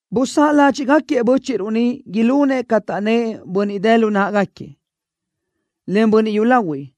Busáʼ ládxiʼgaquiëʼ bö́chiʼruʼ niʼ ilunëʼ ca taʼnnë́ʼ bönniʼ dë lu náʼagaquiëʼ, en bönniʼ yúlahuiʼ,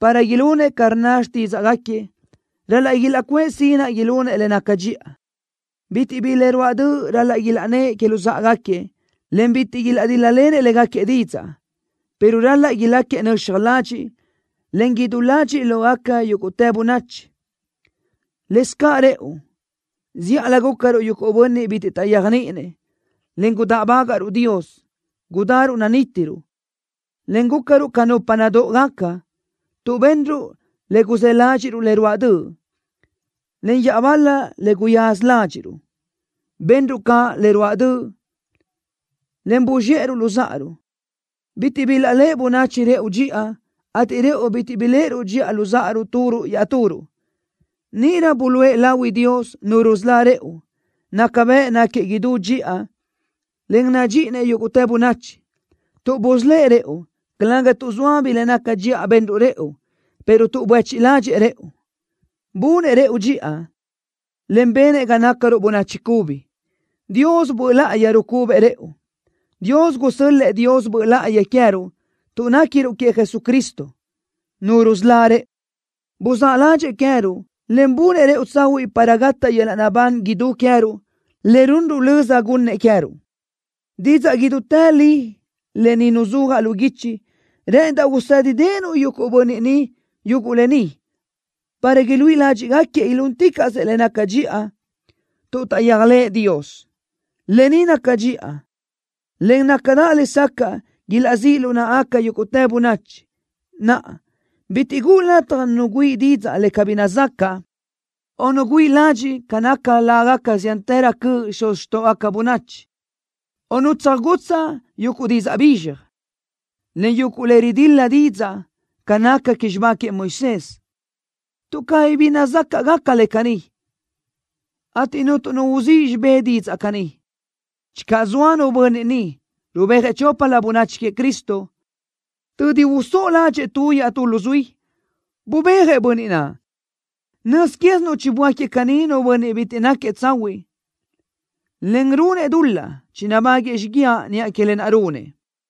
para ilunëʼ ca rnna xtídzaʼgaquiëʼ. Ral-laʼ ilaʼcuʼë sinaʼ ilunëʼ le naca dxiʼa. Bitiʼ bi le ruáʼ döʼ ral-laʼ ilaʼnnë́ʼ que luzáʼagaquiëʼ, en bitiʼ ilaʼdíl-lalenëʼ légaquiëʼ didzaʼ, pero ral-laʼ ilácagaquiëʼ nöxaj ladxiʼ, en idú ladxiʼ lógaca yúguʼtë bönachi. Lëscaʼ rëʼu, zíʼalö gúcaruʼ yuguʼ bönniʼ bitiʼ taʼyéajniʼinëʼ, en gudáʼbagaʼruʼ Dios. Gudaruʼ nanítiruʼ, en gúcaruʼ ca nupa nadóʼogaca, tuʼ benruʼ le guzë́ ládxiʼruʼ le ruáʼ döʼ, en iaʼbal-la le guyaza ládxiʼruʼ. Benruʼ caʼ le ruáʼ döʼ, en buzxéʼeruʼ luzáʼaruʼ. Bitiʼ bilaʼléʼe bönachi rëʼu dxiʼa, ateʼ rëʼu bitiʼ biléʼeruʼ dxiʼa luzáʼaruʼ turuʼ iaʼturuʼ. Níʼirö buluʼe lahui Dios, Nu rusölá rëʼu. Naca bëʼ náquiëʼ idú dxiʼa, en nadxíʼinëʼ yúguʼtë bönachi, tuʼ busölë́ʼ rëʼu, calëga tuʼ zoa bi le naca dxiʼa benruʼ rëʼu, pero tuʼ buéchiʼ ládxëʼë rëʼu. Bunëʼ rëʼu dxiʼa, en benëʼ ga nácaruʼ bönachi cubi. Dios Böʼ Láʼayi rucubëʼ rëʼu. Dios gusö́l-lëʼë Dios Böʼ Láʼayi queë́ruʼ tuʼ néquiruʼ queëʼ Jesucristo, Nu rusölá rëʼu. Buzáʼ ládxëʼë queë́ruʼ, en bunëʼ rëʼu tsahuiʼ para gataʼ yöl-laʼ naʼbán idú queë́ruʼ, le runruʼ löza gunnëʼ queë́ruʼ. Didzaʼ idútë li lë ni nuzúajaʼ lu guichi. Rë́ʼëndaʼ usédideʼenuʼ yuguʼ bönniʼ niʼ yuguʼ lë ni para iluíʼi ládxiʼgaquiëʼ ilúnticaʼsëʼ le naca dxiʼa tuʼ taʼyéajlëʼë Dios. Lë ni naca dxiʼa, en nácadaʼ lesacaʼ ilaʼzíʼ lu náʼagaca yúguʼtë bönachi. Naʼa, bitiʼ guʼu lataj nu güíʼi didzaʼ le cabí nazacaʼ, o nu güíʼi ladxiʼ ca nácagaca lágaca ziántërö cöʼ xuz xtóʼogaca bönachi, o nu tsöjgutsaʼ yuguʼ didzaʼ bizxaj, en yuguʼ le ridil-la didzaʼ ca naca que xibá queëʼ Moisés, tuʼ cabí bi nazácaʼgaca le caní, ateʼ cuntu nu uzíʼ xibé didzaʼ caní. Channö zoa nu bönniʼ niʼ, rubéajëʼ choplö bönachi queëʼ Cristo, tödi usóʼo ládxëʼë tu iaʼtú luzuí, bubéajëʼ bönniʼ naʼ. Nöz quézinuʼ chiböáquiëʼ caní nu bönniʼ bitiʼ náquiëʼ tsahuiʼ, en runëʼ dul-laʼ. Chinabáguëʼë xíguiaʼ niʼa que lë naʼ runëʼ.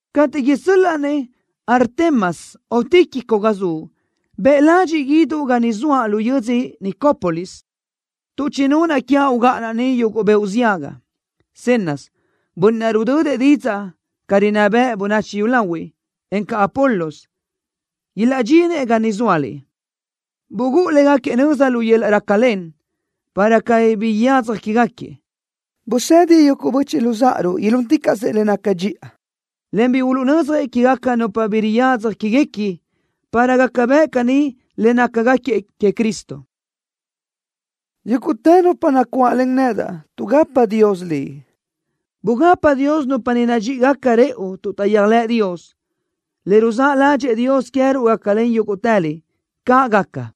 Cateʼ isö́l-laʼa-nëʼ Artemas o Tíquico ga zuʼ, bëʼ ladxiʼ guíduʼ ga ni zoaʼ lu yödzö Nicópolis, tuʼ chinunaʼ quiaʼ ugáʼanaʼ ni yuguʼ beoʼ ziaga. Zenas, bönniʼ naʼ rudödëʼ didzaʼ ca rinná bëʼ bönachi yúlahuiʼ, encaʼ Apolos, ilaʼdxinëʼ ga niʼ zóaliʼ. Bugúʼu légaquiëʼ nöza lu yöl-laʼ rácalen, para cabí bi yadzaj quégaquiëʼ. Busedi yuguʼ böchiʼ luzáʼaruʼ ilúnticaʼsëʼ le naca dxiʼa, en bi uluʼnödzjëʼ quégaca nupa bi riyadzaj quéguequi, para gaca bëʼ caní le nácagaquiëʼ queëʼ Cristo. Yúguʼtë nupa nacuáʼlen nedaʼ tuʼgapa Dios liʼ. Bugapa Dios nupa niʼ nadxíʼigaca rëʼu tuʼ taʼyéajlëʼ Dios. Le ruzáʼ ládxëʼë Dios queë́ruʼ gácalen yúguʼtëliʼ. ¡Caʼ gaca!